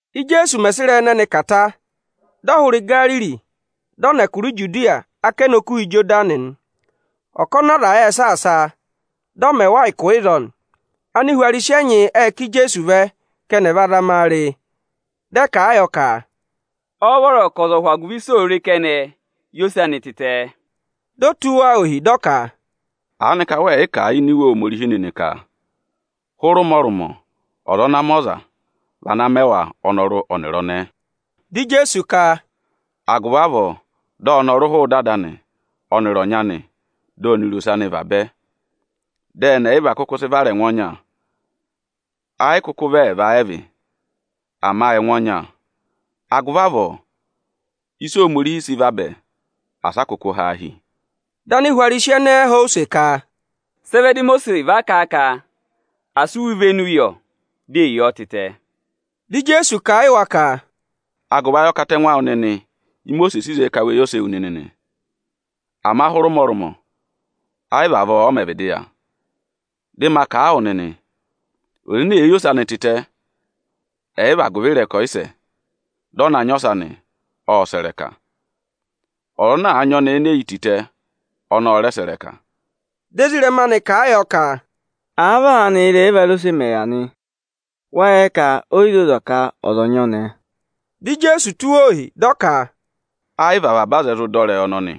Íjeesu mẹ̀ sị ịrẹyị ẹnẹnị kà ta, dị ọ hụrẹ Igariri, dị ọ nọ ẹkụra Ijudiya ákẹnẹ Okuha Ịjọdanị nị. Ọkọnị aza ệ saasa a, dị ọ mẹ wa ụkụ ịzọọ nị. Anihwarisi ẹnyị ệ ká Ijeesu vẹ ka ẹnị ẹ̀ va zama a re. Dị ẹ kà a yọ ka, “Ọ́ọ́ vọrọ ka ọza ọ̀ hụ agụvị ịsị òo re kẹnẹ yi ose anị tịtẹ?” Di o tụ́ wa ohi, dị ọ ka, “Aanịka wẹẹ̀ yị kà a ini Iwe Ohomorihi nịnị ka hụrẹ ụmọrụmọ ọza ana mẹ ọza, vị ana mẹ wa ọnọrụ ọnịrị ọnẹẹ?” Dị Ijeesu ka, “Agụvị avọọ dị ọnọrụ hụụ ịdị ada anị ọnịrị ọnyị anị, dị ọnịrị ose anị vabẹ, dị ẹnị ẹyịva kụkụ sị vara ẹngụ ọnya. Ẹ yị kụkụ vị ẹẹva ẹ vị, ama ẹngụ ọnya. Agụvị avọọ, ịsị Ohomorihi sị vabẹ, asị a kụkụ ha a hi!” Dị Anihwarisi ẹnẹẹ họ̀ ọ use ka, “Sị ẹ vẹ dị Imosiisi va kà a ka à sị iwe ivenu yọ di è yi ọọ tịtẹ?” Dị Ijeesu kà a yị wa ka, “Agụvị ayị ọkatẹngụ awụ nịnị Imosiisi sị zẹẹ ka we yi ose ewu nịnị nị. Ama hụrẹ ụmọrụmọ ẹyị vị avọọ ọ mẹ̀ vịdị yà. Ịkọ 7.10,11Dị ma kà a wụ nịnị, ọza ene èe yi ose anị tịtẹ, ẹ̀ yị vị agụvị ịrẹkọyịsẹ, dị ọ na nyị ọsa nị, ộ sẹ̀ ịrẹka. Ọza ana àa nyị ọnẹẹ ene e yi tịtẹ, ọnị ọ rẹ sẹ̀ ịrẹka.” Dị ezirẹma anị kà a yọ ka, “Àa vị aanị ị́rẹyị ẹvarose mẹ̀ yà nị, wáá yẹ ka o yi zoza ka ọza ọ̀ nyị ọnẹẹ?” Dị Ijeesu tụ́ wa ohi, dị ọ ka, “Ẹ yị vị avaba aza ẹ zụ dọ ịrẹyị ọnọnị,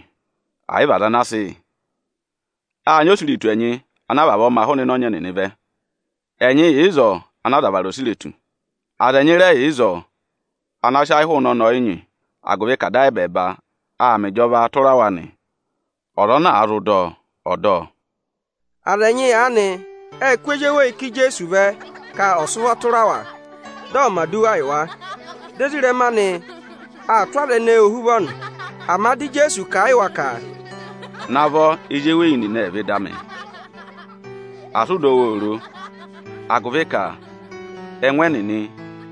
ẹ̀ yị vị aza ana a sị yị. Â nyị osiretu ẹnyị ana a vavọọ ma hụụnị ịnẹ ọnyị ẹnịnị vẹ. Ẹnyị yà ịzọọ ana aza vara osiretu. Aza ẹnyị rẹ yà ịzọọ ana sị ayị hụụnị ọnẹẹ ọyịnyị, agụvị ka Ada ayị ẹbẹẹba aa mẹ ịjọvaa tụra wa nị. Ọza ana àa zụ dọ ọ, ọ̀ dọ ọ!” Aza ẹnyị aanị ệ kụ́ ezi eweyi ká Ijeesu vẹ ka ọ̀ sị ụvọ tụra wa, dị ọ̀ mẹ̀ aduwa yị wa. Dị ezirẹma anị aa tụ́ aza ẹnẹẹ ohuvọ nị. Ama dị Ijeesu kà a yị wa ka, “Navọ ezi eweyi nịnị ẹ̀ vẹ ịda amị, asị ụ dọ wa oro, agụvị ka ẹngụ ẹnịnị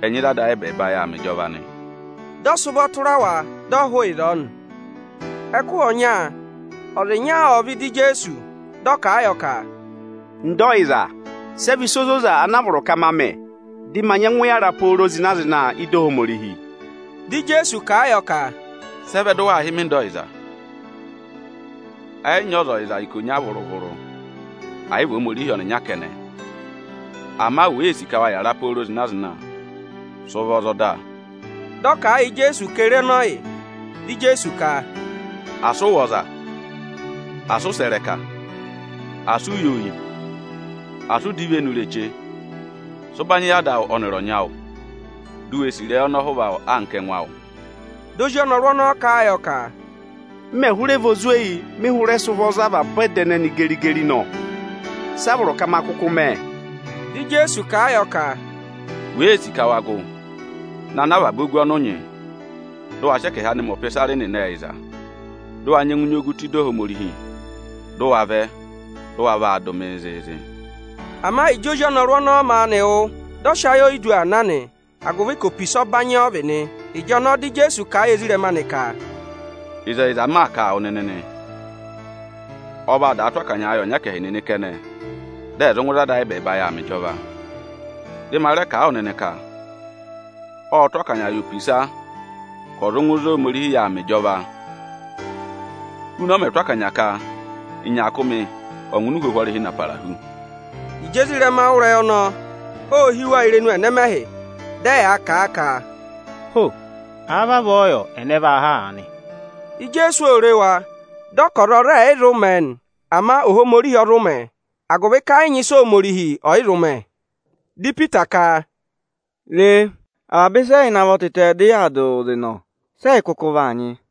ẹ nyị ịzị Ada ayị ẹbẹẹba yà aa mẹ ịjọva nị.” Dị ọ sị ụvọ tụra wa, dị ọ hụụ ịzọọ nị. Ẹkụhị ọnya ọza ịnya ộ vẹ ịda Ijeesu, dị ọ kà a yọ ka, “Ọga ọyịza, sẹ vị ịsa ozoza ana a vọrọ ka ma mẹ, dị ma nyẹngụ yàra pooro zịna-zịna ị́da Ohomorihi?” Dị Ijeesu kà a yọ ka, “Sị ẹ vẹ dị waa hị́ mị ‘Ọga ọyịza’? Ẹ yị nyị ọza ọyịza ikonya vụrụ-vụrụ, ẹ̀ yị vị Ohomorihi ọnịnya kẹnẹ. Ama wèe sì ka wa yàra pooro zịna-zịna, sị ụvọ za ọda!” Dị ọ kà a yị Ijeesu ka ye re ẹnị ọ vị? Dị Ijeesu ka, “Asị ụ wụ̀ ọza; Asị ụ sẹ̀ ịrẹka; Asị u yi oyi; Asị ụ dọ ivenu ireche. Sị ụbanyị yị ada awụ ọnịrị ọnyị awụ! Di u we sì ịrẹyị ọnọhụva anka ẹngụ awụ!” Dị ozi ọnọrụ ọnọọ kà a yọ ka, “M mẹ̀ hụrẹ vị ozweyi mị hụrẹ sị ụvọ za avaba ọda ẹnẹnị geri-geri nọ. Sị a vọrọ ka ma kụkụ mẹ?” Dị Ijeesu kà a yọ ka, “Wèe sì ka wa gụ, na ná avaba ogu ọnị ụ nyị, dị ụ wa sị ẹkẹhị anị mẹ ọpịsarị nịnị ẹyịza, dị ụ wa nyẹngụ nyị ogu tụ́ ịda Ohomorihi. Dị ụ wa vẹ, dị ụ wa vaa dụ mịị zịịzị!” Ama Ịjị ozi ọnọrụ ọnọọ maanị wụ́, dị ọ sị ayị oyidu aa na nị, agụvị ka opisa ọbanyị ọ vị nị. Ịjọnọọ dị Ijeesu kà a yị ezirẹma anị ka, “Ịzẹyịza m maa kà a wụ nịnị nị, ọ vaa daa tụ́ akanyaa yị ọnyẹkẹhị nịnị kẹnẹ, dị ẹ̀ zụ ngụ ịzị Ada ayị ẹbẹẹba yà aa mẹ ịjọva. Dị ma rẹ kà a wụ nịnị ka: Ộ tụ́ akanya yị opisa ka ọ̀ zụ ngụ ịzị Ohomorihi yà aa mẹ ịjọva huna ọ mẹ̀ tụ́ akanya ka ịnyaakụmị ọ̀ ngụ ịnị uhwohwo ọrịhị na para hu.” Ịjị ezirẹma wụ́ ịrẹyị ọnọọ, ô hí wa irenu ẹnẹmẹhị, dị ẹyaa kà a ka, “Ho! Àa vavọọ yọ, ẹnẹ vaa há aanị?” Ijeesu ô re wa, dị ọ ka ọza ọ rẹ ẹ̀ yị zụ mẹ̀ ẹ nị, ama Ohomorihi ọ zụ mẹ̀ ẹ, agụvị ka ẹ yị nyị ịsị Ohomorihi ọ̀ yị zụ mẹ. Dị Ipita ka, “Re, avaba ịsa ẹ́yị navọ tịtẹ, dị yaa dụ wụụ zị nọ; sị ẹyị kụkụ vaa nyị aanị?”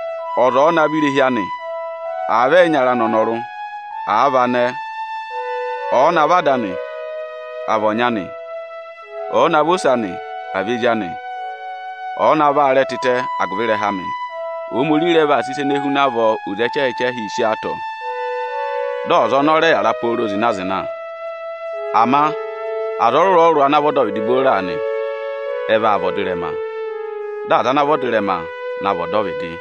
Ọza ọ̀ọ navọ irehi anị, àa vị ẹyịnyara anị anọrụ, àa vị anẹẹ, ọ̀ọ navọ ada anị, àa vị ọnyị anị, ọ̀ọ navọ ose anị, àa vị ezi anị, ọ̀ọ navọ aarẹ tịtẹ agụvị ịrẹha amị, Ohomorihi rẹ vaa sị ịsa ene huna avọọ oze ẹchẹhị-ẹchẹhịị sí ọọ atọ, dị ọza ọnọọ rẹ yàra pooro zịna-zịna. Ama aza ọrụrụ-ọrụrụ ana vị ọdọvịdị booro aanị, ẹ vaa vị ọdịrẹma; dị aza ana vị ọdịrẹma na vị ọdọvịdị.”